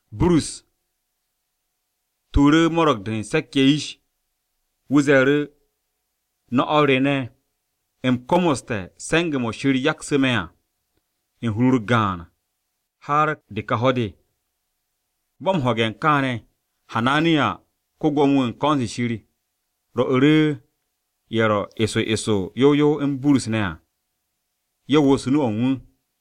Burus tuuru̱ Mo̱ro̱g-de u̱n Se̱k-ye̱ yish, wu̱ ze̱e̱ru̱, “No̱ o̱r re ne̱, u̱m komoste̱ se̱nge̱-mo̱ Shir yaksu̱ me̱ à komo hur u̱n de kaps me̱ á har de ka ho̱-de.” Bo̱ m-ho̱ge̱ kaane̱, Hananiya, ko-Gwo̱mo-wu̱ u̱n ko̱n-se Shir, rwo̱'u̱ru̱ ye̱ ro eso eso yow yow u̱n Burus ne̱ à ye̱ wo̱s nu-o̱ u̱n wu̱.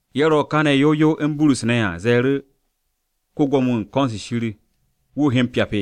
Ye̱ ro kane̱ yow yow u̱n Burus ne̱ à ze̱e̱ru̱, “¿Ko-Gwo̱mo-wu̱ u̱n ko̱n-se Shir wu̱ o he m-pyap?”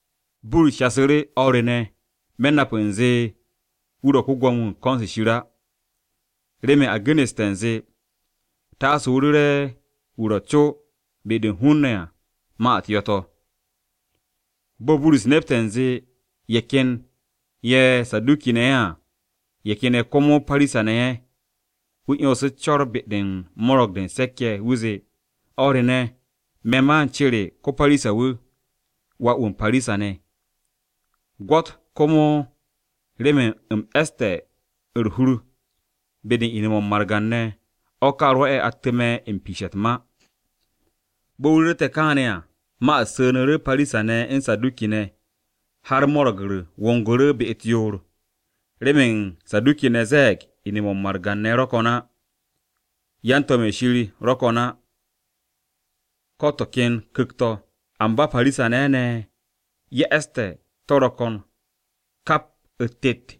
Burus shasu̱ru̱, “O̱r re ne̱, me̱ nap u̱nze wu̱ ro̱ ko-Gwo̱mo-wu̱ u̱n ko̱n-se Shir á. Remen a genu̱ste̱ u̱nze, ‘Taase o ru̱re̱ wu̱ ro̱ co be-de u̱n hun-ne̱ à ma-u̱t yo̱-to̱.’” Bo̱ Burus nepte̱ u̱nze ye̱ ken ye̱ Saduki-ne̱ ye̱ à, ye̱ ken ye̱ komo Parisa-ne̱ ye̱, wu̱ 'yonsu̱ u̱s-co̱r be-de u̱n Mo̱ro̱g-de u̱n Se̱k-ye̱. Wu̱ zee, “O̱r re ne̱, me̱ ma u̱n cere ko-Parisa-wu̱, wà-wu̱ u̱n Parisa-ne̱. Gwo̱t komo remen u̱m e̱ste̱ u̱r-hur be-de u̱n ine̱-mo̱ u̱n margan-ne̱, o̱ ka rwo̱'e̱ attu̱ me̱ m-piishe̱ u̱t-ma.” Bo̱ wu̱ ru̱rte̱ kaane̱ à ma-u̱t su̱nu̱ru̱ Parisa-ne̱ u̱n Saduki-ne̱, har mo̱ro̱g-u̱r wongu̱ru̱ be-u̱t yoor. Remen Saduki-ne̱ ze̱e̱g ine̱-mo̱ u̱n margan-ne̱ ro̱ ko̱n á, yan-to̱m-ye̱ Shir ro̱ ko̱n á, ko̱ to̱ ken ku̱kt-to̱. Amba Parisa-ne̱ ne̱ ye̱ e̱ste̱ to̱ ro̱ ko̱n kap u̱t-tet.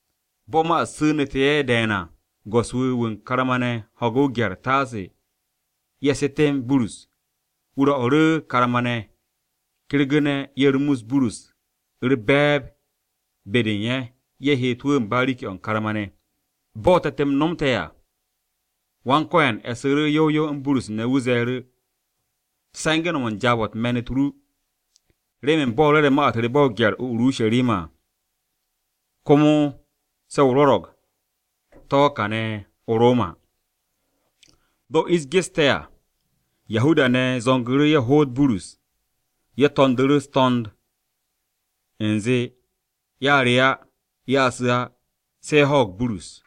Bo̱ ma-u̱t su̱nu̱te̱ ye̱ de̱e̱n à, go̱s-wu̱, wu̱ karma-ne̱ ho̱gu̱ o-gye̱r taase ye̱ setem Burus. Wu̱ rwo̱'u̱ru̱ karma-ne̱ kergu̱ne̱ ye̱ rumus Burus u̱r-be̱e̱b be-de u̱n ye̱, ye̱ heet wu̱ u̱n bariki-o̱ u̱n karma-ne̱. Bo̱ te̱t-m nomte̱ à, Wan-Ko̱yan e̱su̱ru̱ yow yow u̱n Burus ne̱, wu̱ ze̱e̱ru̱, “Se̱nge̱ no̱m u̱n jaab-o̱ me̱n-u̱t ru, remen bo̱ o rwo̱re̱ ma-u̱t re ba o-gye̱r o-Urusharima à, komo se̱ o rwo̱ro̱g to̱ káane̱ o-Roma.” Bo̱ ish geste̱ à, Yahuda-ne̱ zo̱ngu̱ru̱ ye̱ hoot Burus. Ye̱ to̱ndu̱ru̱ u̱s-to̱nd u̱nze ye̱a re̱ á, ye̱a su̱ á, se̱ ye̱ ho̱o̱g Burus.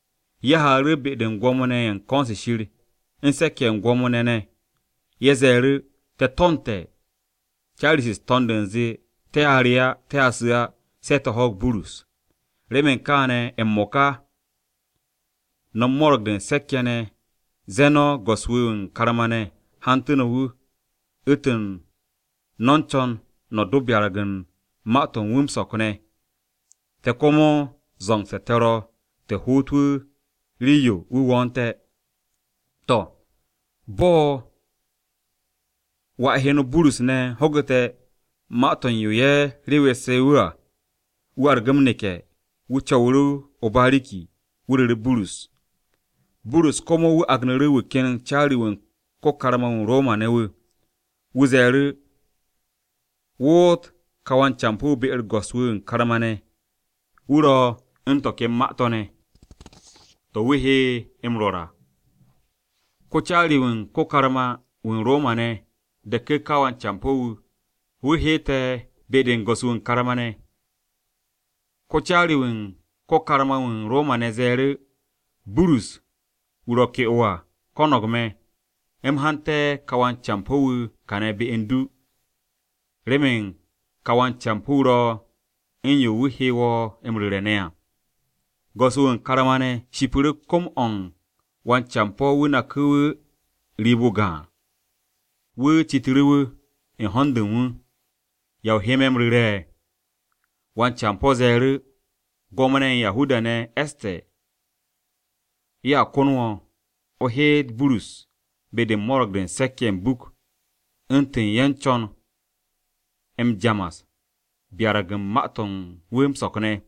Ye̱ haaru̱ be-de u̱n Gwo̱mo-ne̱ ye̱ u̱n ko̱n-se Shir u̱n se̱k-ye̱ u̱n gwo̱mo-ne̱ ne̱. Ye̱ ze̱e̱ru̱, “Te̱ to̱nte̱ caari-se u̱s-to̱nd u̱nze te̱a re á, te̱a su̱ á se̱ te̱ ho̱o̱g Burus. Remen kaane̱ m-mo̱ka, no̱ u̱n Mo̱ro̱g-de u̱n Se̱k-ye̱ ne̱, ze̱e̱ no̱ go̱s-wu̱ wu̱ u̱n karma-ne̱ hantu̱ no̱ wu̱, u̱ntu̱n no̱ u̱n co̱n no̱ do byarag u̱n ma-to̱ u̱n wu̱ m-so̱k ne̱. Te̱ komo zo̱ngse̱ te̱ ro̱ te̱ hoot wu̱ rii-yo wu̱ wo̱o̱nte̱.” To̱, bo̱ wà heno Burus ne̱ ho̱gu̱te̱ ma-to̱ u̱n yo ye̱ rewesse̱ wu̱ à, wu̱ argu̱ m-neke̱. Wu̱ co̱wu̱ru̱ o-bariki, wu̱ ru̱ru̱ Burus. Burus komo wu̱ agnu̱ru̱ wu̱ ken caari-wu̱ u̱n ko-karma-wu̱ u̱n Roma-ne̱ wu̱, wu̱ ze̱e̱ru̱, “Woot ka wan-campo̱-wu̱ be-u̱r go̱s-wu̱ wu̱ u̱n karma-ne̱, wu̱ ro̱ u̱n to̱ ken ma-to̱ ne̱ to̱ wu̱ he wu̱ m-rwo̱r à.” Ko-caari-wu̱ u̱n ko-karma-wu̱ u̱n Roma-ne̱ deku̱ ka wan-campo̱-wu̱, wu̱ heete̱ be-u̱r go̱s-wu̱ wu̱ u̱n karma-ne̱. Ko-caari-wu̱ u̱n ko-karma-wu̱ u̱n Roma-ne̱ ze̱e̱ru̱, “Burus wu̱ ro̱ ke'o à ko̱no̱g me̱, u̱m hanté̱ ka wan-campo̱-wu̱ kane̱ be u̱n du, remen ka wan-campo̱-wu̱ ro̱ u̱n yo wu̱ he wo̱ m-ru̱re̱ ne̱ à.” Go̱s-wu̱ u̱n karma-ne̱ shipu̱ru̱ kom-o̱ u̱n wan-campo̱-wu̱ naku̱ wu̱ riib-o gaan. Wu̱ citu̱ru̱ wu̱, u̱n hond u̱n wu̱, “¿Ya o he me̱ m-ru̱re̱?” Wan-campo̱ ze̱e̱ru̱, “Gwo̱mo-ne̱ u̱n Yahuda-ne̱ e̱ste̱ ye̱a kon wo̱, o heet Burus be-de u̱n Mo̱ro̱g-de u̱n Se̱k-ye̱ m-buk, u̱ntu̱n ye̱ u̱n co̱n m-jamas byarag u̱n ma-to̱ u̱n wu̱ m-so̱k ne̱.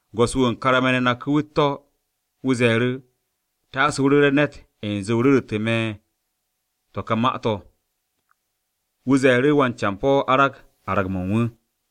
Go̱s-wu̱ u̱n karma-ne̱ naku̱ wu̱ u̱t-to̱. Wu̱ ze̱e̱ru̱, “Taase o ru̱re̱ ne̱t u̱nze o ru̱ru̱tu̱ me̱ to̱ ka ma-to̱.” Wu̱ ze̱e̱ru̱ wan-campo̱ arag arag-mo̱ u̱n wu̱.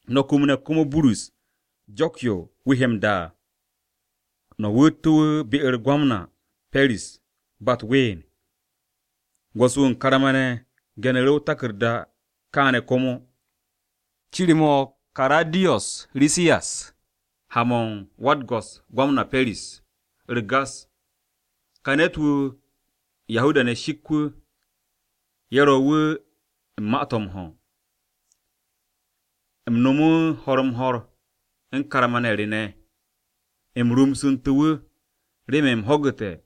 No̱ kumne̱ komo Burus jo̱k-ye̱ wu̱ he m-da à. No̱ wo̱ttu̱ wu̱ be-u̱r ko-Gwamna Pe̱ris ba u̱t-ween.” Go̱s-wu̱ u̱n karma-ne̱ genu̱ru̱ o-taku̱rda kaane̱ komo: Cir-mo̱ o-Karadiyos Risiyas, ha-mo̱ u̱n Wa-u̱t-go̱s Gwamna Pe̱ris. U̱r-Gas! Ka ne̱t-wu̱, Yahuda-ne̱ shik wu̱. Ye̱ ro̱ wu̱ u̱n ma-to̱ m-ho̱. U̱m no̱mu̱ ho̱r-m-ho̱r u̱n karma-ne̱ re ne̱, u̱m rumsu̱ntu̱ wu̱, remen u̱m ho̱gu̱te̱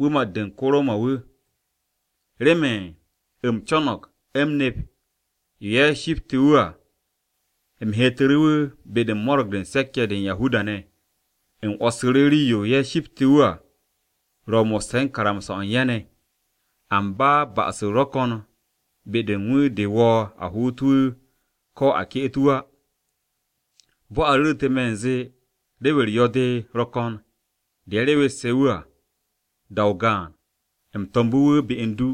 wu̱ mat-de u̱n ko-Roma-wu̱. Remen u̱m co̱no̱g u̱m nep yo ye̱ shipte̱ wu̱ à, u̱m heetu̱ru̱ wu̱ be-de u̱n Mo̱ro̱g-de u̱n Se̱k-ye̱ de u̱n Yahuda-ne̱. U̱m 'wo̱ssu̱ru̱ rii-yo ye̱ shipte̱ wu̱ à ro̱ mo̱sse̱ o-karamsa o̱ u̱n ye̱ ne̱. Amba ba'as-u̱r ro̱ ko̱n be-de u̱n wu̱ de wo̱o̱ a hoot wu̱, ko̱ a ke'et wu̱ á. Bo̱ a ru̱ru̱tu̱ me̱ u̱nze rew-u̱r yo̱-de ro̱ ko̱n de ye̱ rewesse̱ wu̱ à, da-o gaan, u̱m to̱mbu̱ wu̱ be u̱n du.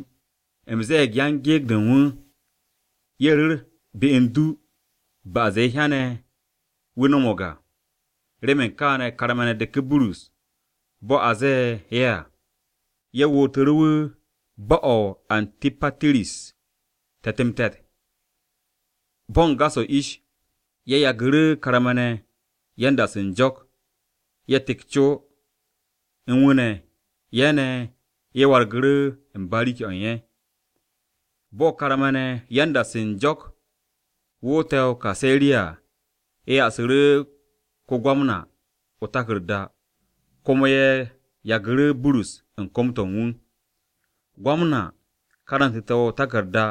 U̱m ze̱e̱g yan-gyekt-se u̱n wu̱, ye̱ ru̱r be u̱n du ba'as-de ye̱ hyane̱ wu̱ no̱mo̱g à. Remen kaane̱, karma-ne̱ deku̱ Burus, bo̱ a ze̱e̱ ye̱ à. Ye̱ wootu̱ru̱ wu̱ bo̱-o̱ o-Antipatiris te̱t-m-te̱t. Bo̱ u̱n gas-o̱ ish, ye̱ yagu̱ru̱ karma-ne̱ yan-da-se u̱n jo̱k, ye̱ tek co u̱n wu̱ ne̱, ye̱ ne̱, ye̱ wargu̱ru̱ u̱n bariki-o̱ u̱n ye̱. Bo̱ karma-ne̱ yan-da-se u̱n jo̱k woote̱ o-Kaseriya à, ye̱ ya'asu̱ru̱ ko-Gwamna o-taku̱rda, komo ye̱ yagu̱ru̱ Burus u̱n kom-to̱ u̱n wu̱. Ko-Gwamna karantu̱ru̱ o-taku̱rda,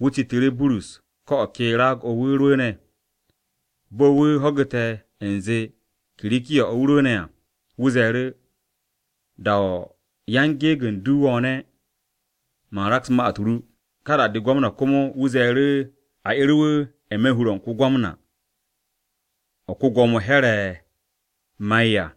wu̱ citu̱ru̱ Burus ko̱ o̱ ke raag-o̱ wu̱ rwu̱u̱ne̱. Bo̱ wu̱ ho̱gu̱te̱ u̱nze Kirikiya-o̱ wu̱ rwu̱u̱ne̱ à, wu̱ ze̱e̱ru̱, “Da-o̱ yan-gyekt-u̱s ru wo̱o̱ne̱, man raks ma-u̱t ru.” Ka da-de, ko-Gwamna komo wu̱ ze̱e̱ru̱ a 'er wu̱ n-me̱ hur-o̱ u̱n ko-Gwamna, o̱ ko-Gwo̱mo Here̱ ma'e̱ à.